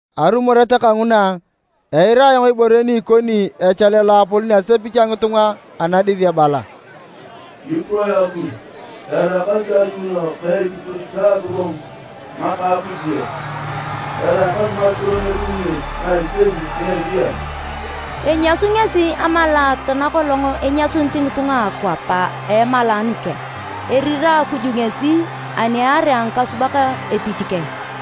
Arumoret kanguna, eira ibore ni ikoni echale loapolon a asepich a ngitunga anadis ebala, “Kipuroe Akuj! Eraakasi ayuuno ka ekipur ta agogongu ngaka a Akuj yok. Eraakasi ngakiro na edunguni ngesi na iteni na eriyan! Enyasu ngesi amalaat nakolong enyasunit ngitunga a akwap a emalaanu keng. Erira Akuj ngesi ani aarea ngikasubak etich keng.”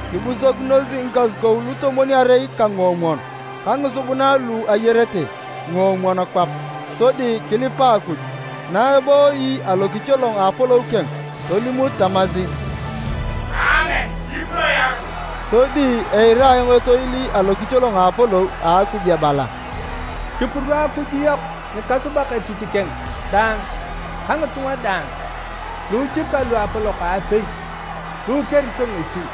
Kibusokinos ngikasukou lutomwon-arei ka nguomwon ka ngisubuna lu ayarete nguomwon kwap sodi kilipa Akuj, na ebooyi alokicholong a apolou keng. Tolimut tamasi, “Aamen! Kipuroe Akuj!” Sodi eira ayong etoil alokicholong a apolou a Akuj ebala “Kipuro Akuj yok, ngikasubak etich keng daang ka ngitunga daang, luuchika ka luapolok aapei, lu ikerito ngesi!”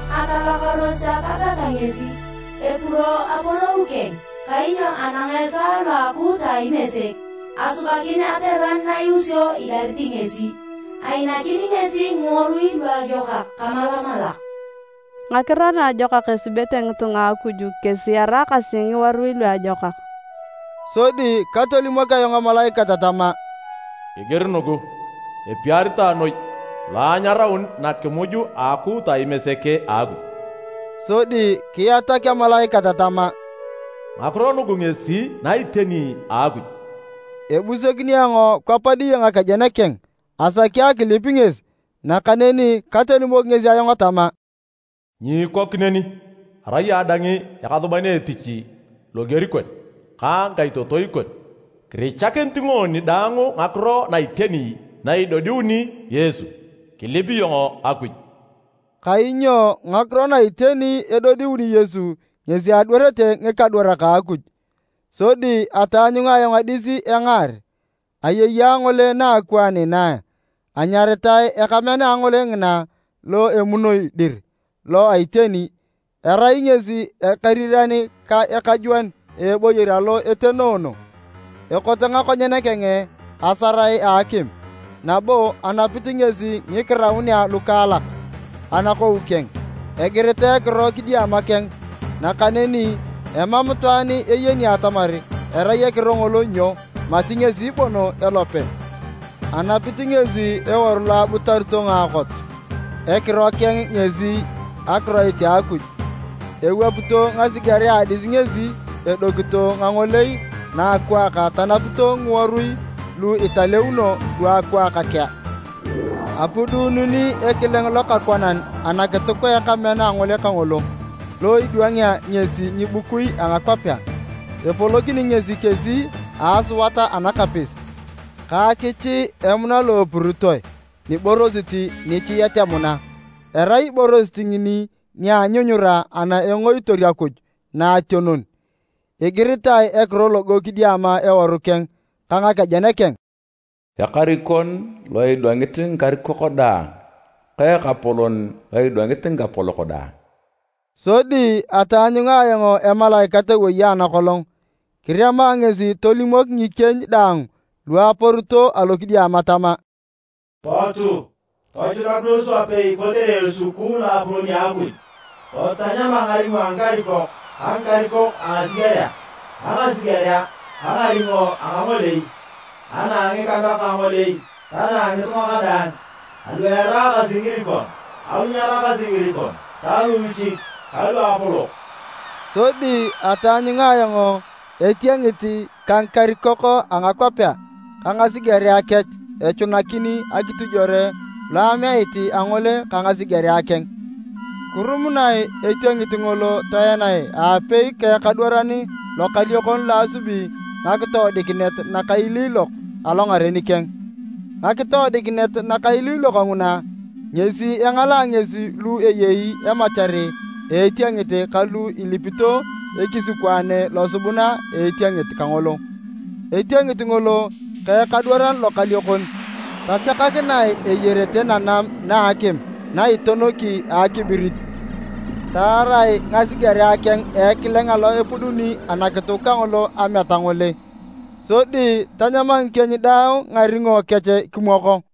Atalakaros atagata ngesi, epuro apolou keng! Kainyo anang esaa lo a akuuta a Imesek, asubakin ateran na iusio idarit ngesi. Ainakin ngesi ngiworui luajokak kamalamalak.” (Ngakiro naajokak esubete ngitunga a Akuj kesi eraakasi ngiworui luajokak). Sodi katolimok ayong emalaikat tama, “Kigir nugu: Epiaritae noi lu anyaraun nakimuj a akuuta a Imesek a Akuj.” Sodi kiatak emalaikat tama, “Ngakiro nugu ngesi na iteni a Akuj.” Ebusokin ayong kwap diye ngakejen keng asaki akilip ngesi, nakaneni katolimok ngesi ayong tama, “Nyiikok neni! Arai ayong dang ekasuban etich loger kon ka ngikaitotoi kon, kirichakinit ngoni daang ngakiro na iteni na edodiuni Yesu. Kilip iyong Akuj!” Kainyo ngakiro na iteni edodiuni Yesu ngesi adwarete ngikadwarak a Akuj. Sodi ataanyunga ayong adis engaar, ayei angole naakwaan inaa. Anyaritae ekamean angole ngina, lo Emunoi dir lo a Iteni. Erai ngesi ekeriran ka ekajwon a eboyor alo etenoono. Ekote ngakonyen keng asarae a akim nabo anapit ngesi ngikiraunea lukaalak anakou keng. Egiritae ekiro kidiama keng, nakaneni emam itwaan eyeni atamar erai ekiro ngolo nyo mati ngesi bon elope. Anapit ngesi eworu lo abutarito ngaakot. Ekiro keng ngesi, “Akiroit a Akuj.” Ewapito ngasigerea a adis ngesi edokito ngangolei naakwaak tanapito ngiworui lu italeuno luakwaak kea. Apudununi ekileng lokakwanan anakituk a ekamean angole kangolo lo idwangea ngesi ngibukui a ngakwapea. Epolokini ngesi kesi a asuat anakapis ka akichii emuna lo epuritoe niborosit nichiet emuna, erai iborosit ngini nia anyunyura ana engoitor Akuj Naationon. Egiritae ekiro logo kidiama eworu keng ka ngakejen keng, “Ekarikon lo idwangit ngikarikok daang ka Ekapolon lo idwangit ngikapolok daang.” Sodi ataanyunga ayong emalaikat ewei anakolong. Kirema ngesi tolimok ngikieny daang lu aporito alokidiama tama, “Potu! Tochunakinos wapei kotere esukukuu loapolon a Akuj! Potu tanyama ngaringo a ngikarikok ka ngikarikok a ngasigerea ka ngasigerea ka ngaringo a ngangolei ka na a ngikameak ngangolei ta na a ngitunga kadaang, alu eraakasi ngirikon ka lu nyeraakasi ngirikon ta luuchik ka luapolok!” Sodi ataanyunga ayong etiengit ka ngikarikok a ngakwapea ka ngasigerea kech echunakin akitojwore lo ameat angole ka ngasigerea keng. Kirumunae etiengit ngolo toenae aapei ka ekadwaran lokaliokon lo asubi ngakitoodikinet nakailiilok alongaren keng. (Ngakitoodikinet nakailiilok nguna ngesi engalaa ngesi lu eyei emachar a etiengit ka lu elipito ekisikwaane losubuna a etiengit kangolo.) Etiengit ngolo ka ekadwaran lokaliokon, tachakakinae eyarete nanam na a akim na itonoki akibirit. Taarae ngasigerea keng a ekileng alo epuduni anakituk kangolo ameat angole. Sodi tanyama ngikieny daang ngaringo kech kimwoko.